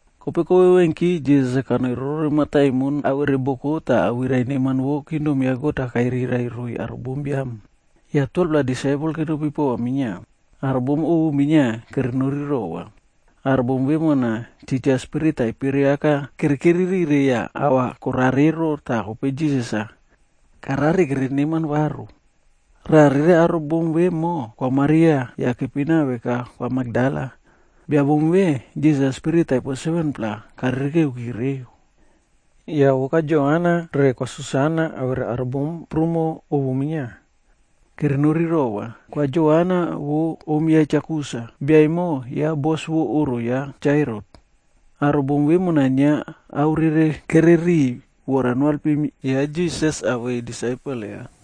Kope kovevenki, Jisas-a kanoi rorore mataimon awere boko tah awirai neman vo kingdom ya God kairirai roiy aro bombiam. Yah 12-pla disaipel kenopi pova minia. Aro bom ovu minia kere nori rova. Aro bom vemona, titja spirit taipere aka kerekeri rire yah ahva korare ero, tah kope Jisas-a karare kere neman varu. Raꞌa rere aro bom vemo, vo Kwa Maria, yah kepina veka Kwa Makdala. Bia bom ve, Jisas-a spirit taipo 7-pla karirikereki reu. Yah vo Kwa Joana re Kwa Susana awere aro bom prumo ovu minia, kere nori rova. Kwa Joana vo om ya Cha Kusa, bia emo ya bos vo oꞌro ya Cha Herot. Aro bom vemona inia ao rere kereriy vora noalpim ya Jisas awei disaipel ya.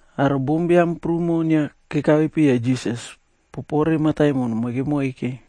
Aro bombiam prumo inia kekape piya Jisas popore mataimon moike moike.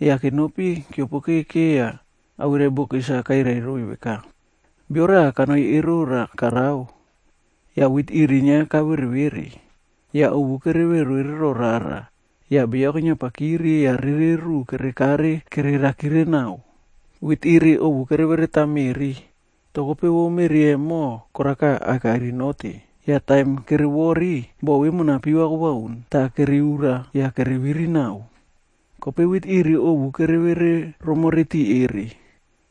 Yah kenopi keopokeke yah awirai bokis-a kairai roiy veka, “Bio raꞌa kanoi erora karao. Yah wit iri inia kavere vere, yah ovu kere vere ro rara, yah beyo keniapakiri yah rere ruꞌu kere kare kererakire naꞌao. Wit iri ovu kere vereta meꞌri, toh kope vo meꞌri emo koraka akairi note. Yah taim kere wori, bo vemona piva kobauni, tah kere urura yah kere viri naꞌao. Kope wit iri ovu kere vere romore tiꞌi erere.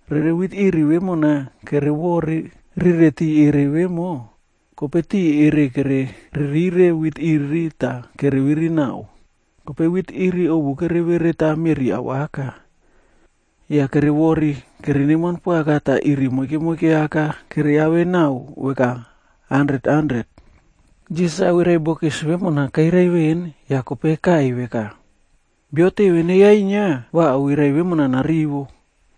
Rere wit iri vemona kere wori rire tiꞌi erere vemo, kope tiꞌi erere kere ririre wit iri tah kere viri naꞌao. Kope wit iri ovu kere vereta meꞌri awaka, yah kere wori kere neman poaka tah iri moike moike aka keriave naꞌao veka handret handret.” Jisas-a awirai bokis vemona kairai veꞌen, yah kope kaꞌai veka, “Bio teve neyainia, va awirai vemona narivo.”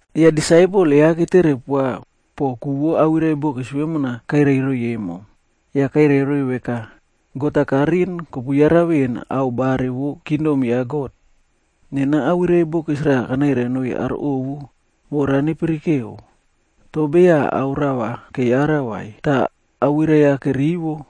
Yah disaipel ya ketere poa poꞌo ku vo awirai bokis vemona kairai roiy emo. Yah kairai roiy veka, “God-a kariꞌin kopu yara veꞌen ao bare vo kingdom ya God. Nena awirai bokis raꞌa kanairai noiy aro ovua vora nepirikeo, toh beya ao rava keyara vai. Tah awirai-a kerivo,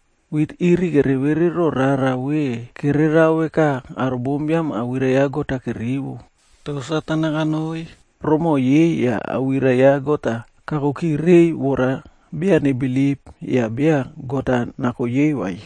Wit iri kerevere ro rara ve kererao veka aro bombiam awirai ya God-a kerivo, toh Satan-a kanoi romoꞌo yei yah awirai-a ya God kakoki reiy vora beya nebilip yah beya God-a nako yei vai.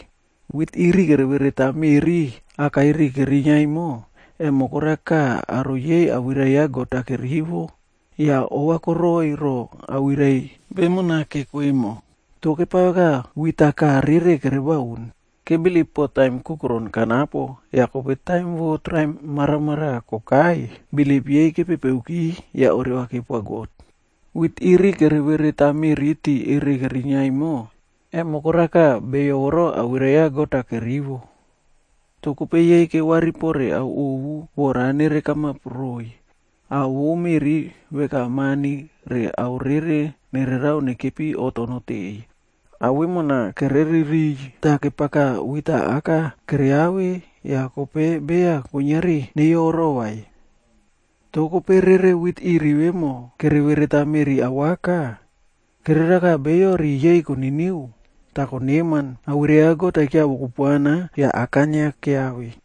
Wit iri kere vereta meꞌri akairi kerinia emo, emo koraka aro yei awirai ya God-a kerivo yah ova koroiy ro awirai vemona keko emo. Toh kepao veka wit-a kaꞌa rere kere baun. Kebilip poꞌo taim kukuron kanapo yah kope taim vo traim maramaraꞌa kokai, bilip yei kepepeoki yah oreva kepoa God. Wit iri kere vereta meꞌri tiꞌi erere kerinia emo, emo koraka beyo voro awirai ya God-a kerivo. Toh kope yei kewari pore ao ovu vora nere kamap roiy, ao vo meꞌri veka mani re ao rere nererao nekepi oꞌto noteꞌeiy, ao vemona kereririy. Tah kepaka wit-a aka keriave yah kope beya kuiniari neiyoro vai. Toh kope rere wit iri vemo kere vereta meꞌri awaka, kereraka beyo riꞌi yei koniniu tah koneman, awirai ya God-a kiawo kupuana, yah aka inia keyawe.”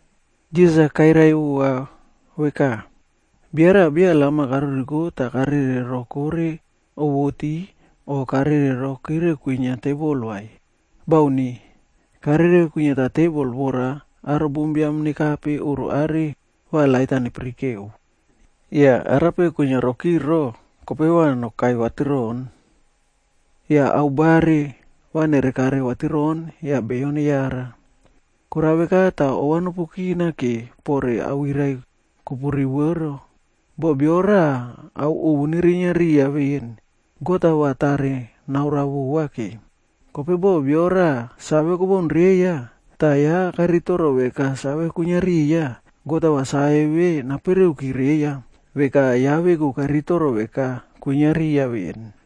Jisas-a kairai vova veka, “Bia raꞌa beya lam-a karuriko tah karere rokore owoti o karere rokore kwinia tebol vai. Bauni. Karere kwiniata tebol vora aro bombiam nekape oꞌro are va lait nepirikeu. Yah arape kwinia rokire ero, kope va nokai vatiroꞌon. Yah ao bare, va nerekare vatiroꞌon yah beyo neyara. Korao veka tah ova nopu kinake pore awirai kopu rivo ero. Boh bio raꞌa ao ovu nerinia riya veꞌen, God-a va tare naoroa vova ke. Kope boh bia raꞌa save kobaun reiya, tah ya karitoro veka save kwinia riya, God-a va save ve napereuki reiya, veka ya veku karitoro veka kwinia riya veꞌen.”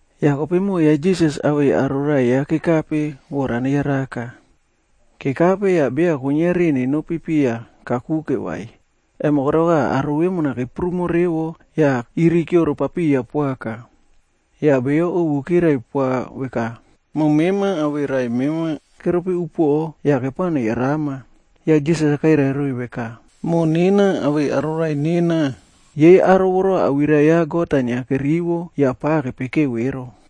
Yah kope moꞌo ya Jisas awei aro raꞌai ya kekape vora neyaraka. Kekape, yah beya kuiniari nenopi piya kakuke vai, emo koraka aro vemo keprumo revo yah irikioro papiya poaka. Yah beyo ovu kirai poa veka, “Moꞌo mema awei raꞌai mema keropi upuoꞌo yah kepao neyarama.” Yah Jisas-a kairai roiy veka, “Moꞌo nena awei aro raꞌai nena, yei aro voro awirai ya God inia kerivo yah pa kepekeo ero.”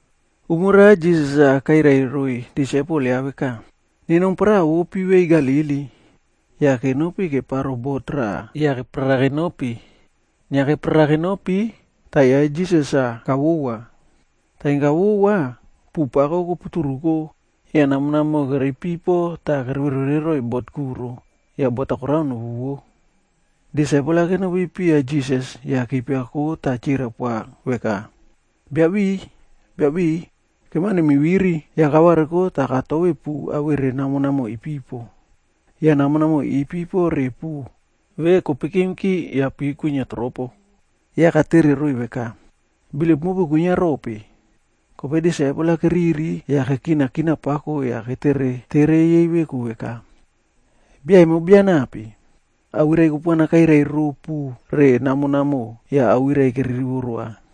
Umo raꞌa Jisas-a kairai roiy disaipel ya veka, “Nenom paraꞌa vo pivei Galili.” Yah kenopi keparo bot raꞌa yah keparara kenopi. Inia keparara kenopi, tah ya Jisas-a kavowa. Taim kavowa, puꞌu pako koputuruko yah namo namoꞌo kere ipipo tah kere vere vere roiy bot kuro yah bot korao novuwo. Disaipel kenopi piya Jisas yah kipiako tah kirai poa veka, “Biabiꞌiy, Biabiꞌiy, kemao nemiviri!” Yah kavariko tah katove puꞌu awere namo namoꞌo ipipo. Yah namo namoꞌo ipipo re puꞌu ve kopikimki yah pi kwinia tropo. Yah katere roiy veka, “Bilip mopu kwinia rope?” Kope disaipel-a keriri yah kekina kina pako yah ketere tere yei veku veka, “Bia emo bia nape, awirai kupuana kairai ro puꞌu awere namo namoꞌo yah awirai kere rivo roa?”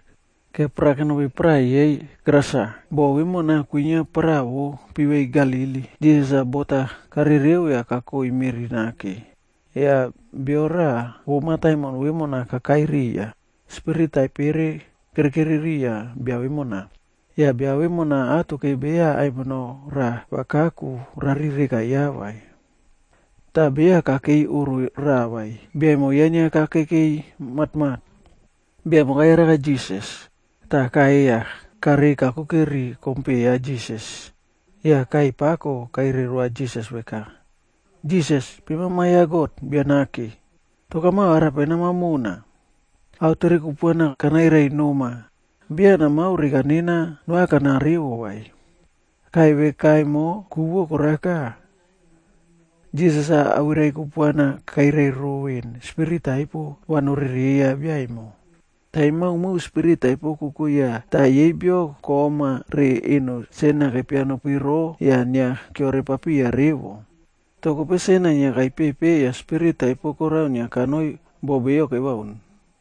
Keparara kenopi paraꞌa yei Gerasa. Bo vemona kwinia paraꞌa vo pivei pako Galili. Jisas-a bot-a karereo yah kakoi meꞌri nake, yah bio raꞌa vo mataimon vemona kakai riya. Spirit taipere kerekeri riya bia vemona. Yah bia vemona atoke beya aimino raꞌa va kaku rari reka ya vai. Tah beya kakei oꞌro raꞌa vai. Bia emo ya inia kakekei matmat. Bia emo kayaraka Jisas, tah kaꞌai yah karei kakuke ri kompe ya Jisas. Yah kaꞌai pako kairai roa Jisas veka, “Jisas, mema Ma ya God Bia Nake! Toh kamao arape nama mona? Ao tere kupuana kanairai noma, beya namao reka nena noakana revo vai.” Kaꞌai veka emo, ku vo koraka, Jisas awirai kupuana kairai ero veꞌen spirit taipo va norereiya bia emo. Taim maomao spirit taipo koko ya, tah yei bio kom-a re eno sen-a kepia nopiro yah inia keore papiya revo. Toh kope sen-a inia kaipepe yah spirit taipo korao inia kanoi bo beyo kebaun.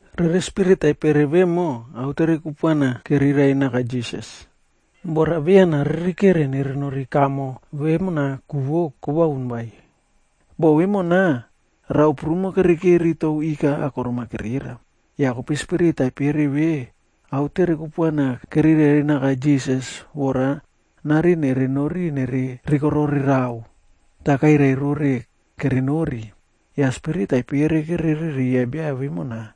Rere spirit taipere vemo autere kupuana kerirai naka Jisas, vora beya naririkereki nere nori kamo vemona ku vo kobaun vai. Boko vemona, rao prumo kere keri tou ika akorom-a kerera. Yah kope spirit taipere ve autere kupuana kerirai naka Jisas vora nariꞌin nere nori nere rikorore rao, tah kairai rore kere nori. Yah spirit taipere kere rereiya bia vemona,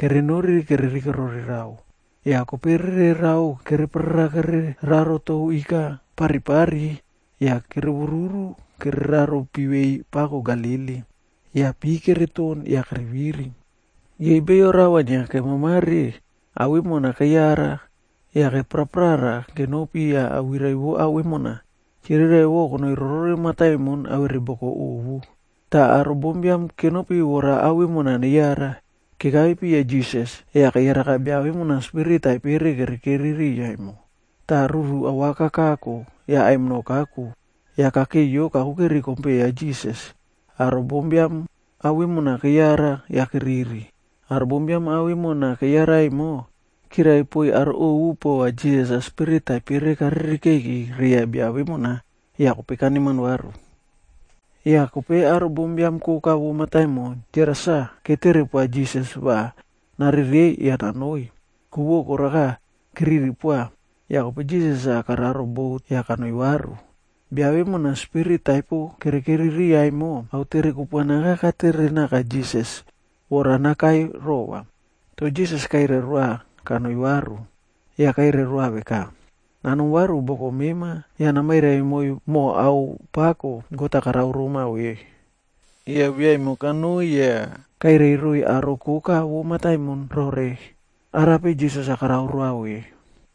kere nori kere rikorore rao. Yah kope rere rao kere praprara kere raro tou ika paripari yah kere wuwuru kereraro pivei pako Galili, yah pi kere ton yah kere viri. Yei beyo rao-a inia kemamare, ao vemona keyara yah kepraprara kenopi yah awirai vo ao vemona, chirirai konoi rorore mataimon awere boko ovu. Tah aro bombiam kenopi vora ao vemona neyara. Kekape piya Jisas, yah keyaraka bia vemona spirit taipere kere rereiya emo. Tah ruru awaka kako yah aimino kaku yah kakeiyo kakuke ri kompe ya Jisas. Aro bombiam ao vemona keyara yah keriri. Aro bombiam ao vemona keyara emo, kirai poiy aro ovu pova Jisas-a spirit taipere karirikeiki reiya bia vemo yah kope kaneman varu. Yah kope aro bombiam koka vo mataimon Gerasa ketere poa Jisas va narerei yah nanoi, ku vo koraka keriri poaka. Yah kope Jisas kanoi kararo bot yah kanoi varu. Bia vemona spirit taipo kere rereiya vemo, autere kupuana aka katere naka Jisas vora nakai rova, toh Jisas kairai roa kanoi varu. Yah kairai roa veka, “Nanom varu boko mema yah namairai moiy moho ao pako God-a karao roma vemo.” Yah biaemo kanoi yah kairai roiy aro koka vo mataimon rore arape Jisas karao roa ve.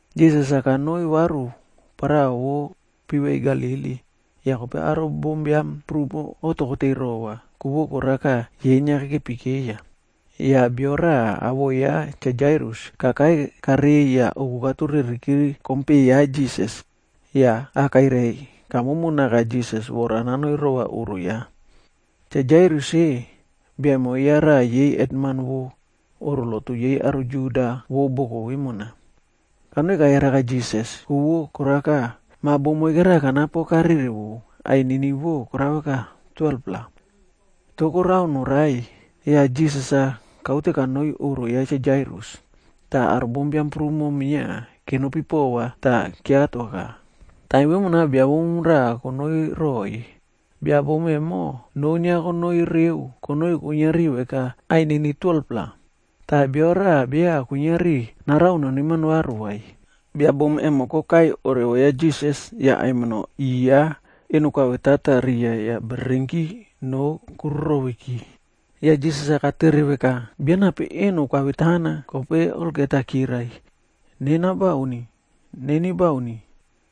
Jisas-a kanoi varu paraꞌa vo pivei Galili, yah kope aro bombiam prumo oꞌto koteiy rova, ku vo koraka, yei inia kekepi keiya. Yah bio raꞌa awoꞌo ya Cha Jairus kakai karei yah oku katureriki ri kompe ya Jisas yah akairai kamomo naka Jisas vora nanoi rova oꞌro ya. Cha Jairus-e, bia emo ya raꞌa yei hetman vo oꞌro lotu yei aro Juda vo boko vemona. Kanoi kayaraka Jisas, ku vo koraka, ma bom moike raꞌa kanapo karerewo, ainini vo koraka 12-pla. Tah korao norai. Yah Jisas-a kaute kanoi oꞌro ya Cha Jairus, tah aro bombiam prumo minia kenopi pova tah kiatoaka. Taim vemona bia bom raꞌa konoi roiy. Bia bom emo, noo inia konoi reo konoi kuiniari veka ainini 12-pla,c tah bio raꞌa beya kuiniari narao noneman varu vai. Bia bom emo kokai oreva ya Jisas yah aimino i ya eno koavetata riya yah bererenki noo koruroveki. Yah Jisas katere veka, “Bia nape eno kavetana?” Kope olgeta kirai, “Nena bauni. Neni bauni.”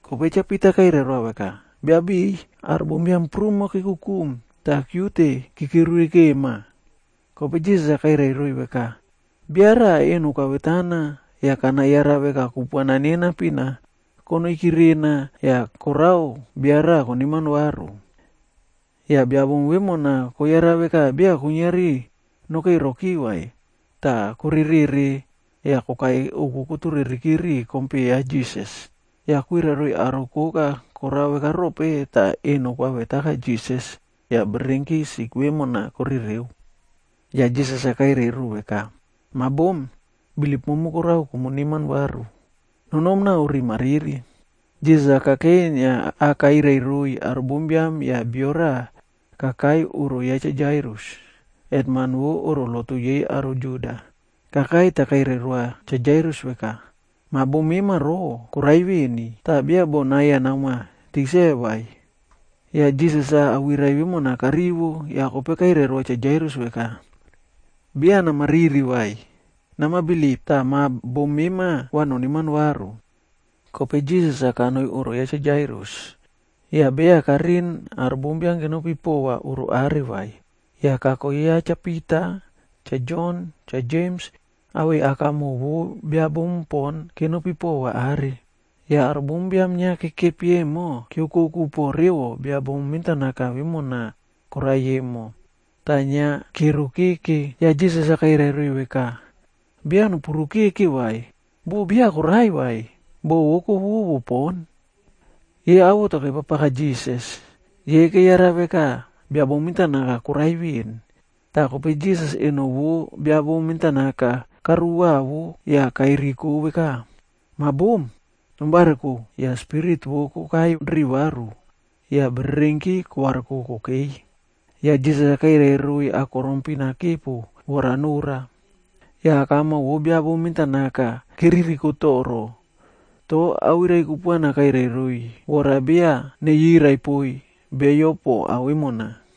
Kope Cha Pita kairai roa veka, “Biabiꞌiy, aro bombiam prumo kekukum tah kiute kekirivikema.” Kope Jisas kairai roiy veka, “Bia raꞌa eno kavetana yah kana yara veka kupuana nena pina konoiki rena yah korao bia raꞌa koneman varu.” Yah bia bom vemona koyara veka beya kuiniari nokei roki vai, tah korerere yah kokai ouku kotureriki ri kompe ya Jisas. Yah kwirai roiy aro koka korao veka rope tah eno koavetaka Jisas yah bererenki sik vemona korereo. Yah Jisas kairai ro veka, “Ma bom, bilip momu korao komu neman varu. Nonom nao riꞌi mariri.” Jisas kakei inia akairai roiy aro bombiam yah bio raꞌa kakei oꞌro ya Cha Jairus, hetman vo oꞌro lotu yei aro Juda, kakai tah kairai roa Cha Jairus veka, “Ma bom mema ero, korai veni, tah beya boꞌo nai-a namoa tikse vai.” Yah Jisas-a awirai vemona karivo yah kope kairai roa Cha Jairus veka, “Beya namariri vai, nama bilip, tah ma bom mema va noneman varu.” Kope Jisas kanoi oꞌro ya Cha Jairus, yah beya kariꞌin aro bombiam kenopi pova oꞌro are vai. Yah kako ya Cha Pita, Cha Jon, Cha Jems, awei akamoꞌo vo bia bom pon kenopi pova are. Yah aro bombiam inia kekepi emo, kiokoku poꞌo revo bia bom mentanaka vemona korai emo tah inia kero keke. Yah Jisas kairai roiy veka, “Beya nopuro keke vai, boh beya korai vai, boh vo kowowo pon.” Yei awoto kepapaka Jisas, yei keyara veka biabom mentanaka korai veꞌen. Tah kope Jisas eno vo bia bom mentanaka karuwavo yah kairiko veka, “Ma bom, nom variko!” Yah spirit vo kokai ri varu yah bererenki kovariko kokei. Yah Jisas kairai roiy akorom pin-a kepo vora nora. Yah akamoꞌo vo biabom mentanaka kere ririko toro, toh awirai kupuana kairai roiy, vora beya neyirai poiy beyo po ao vemona.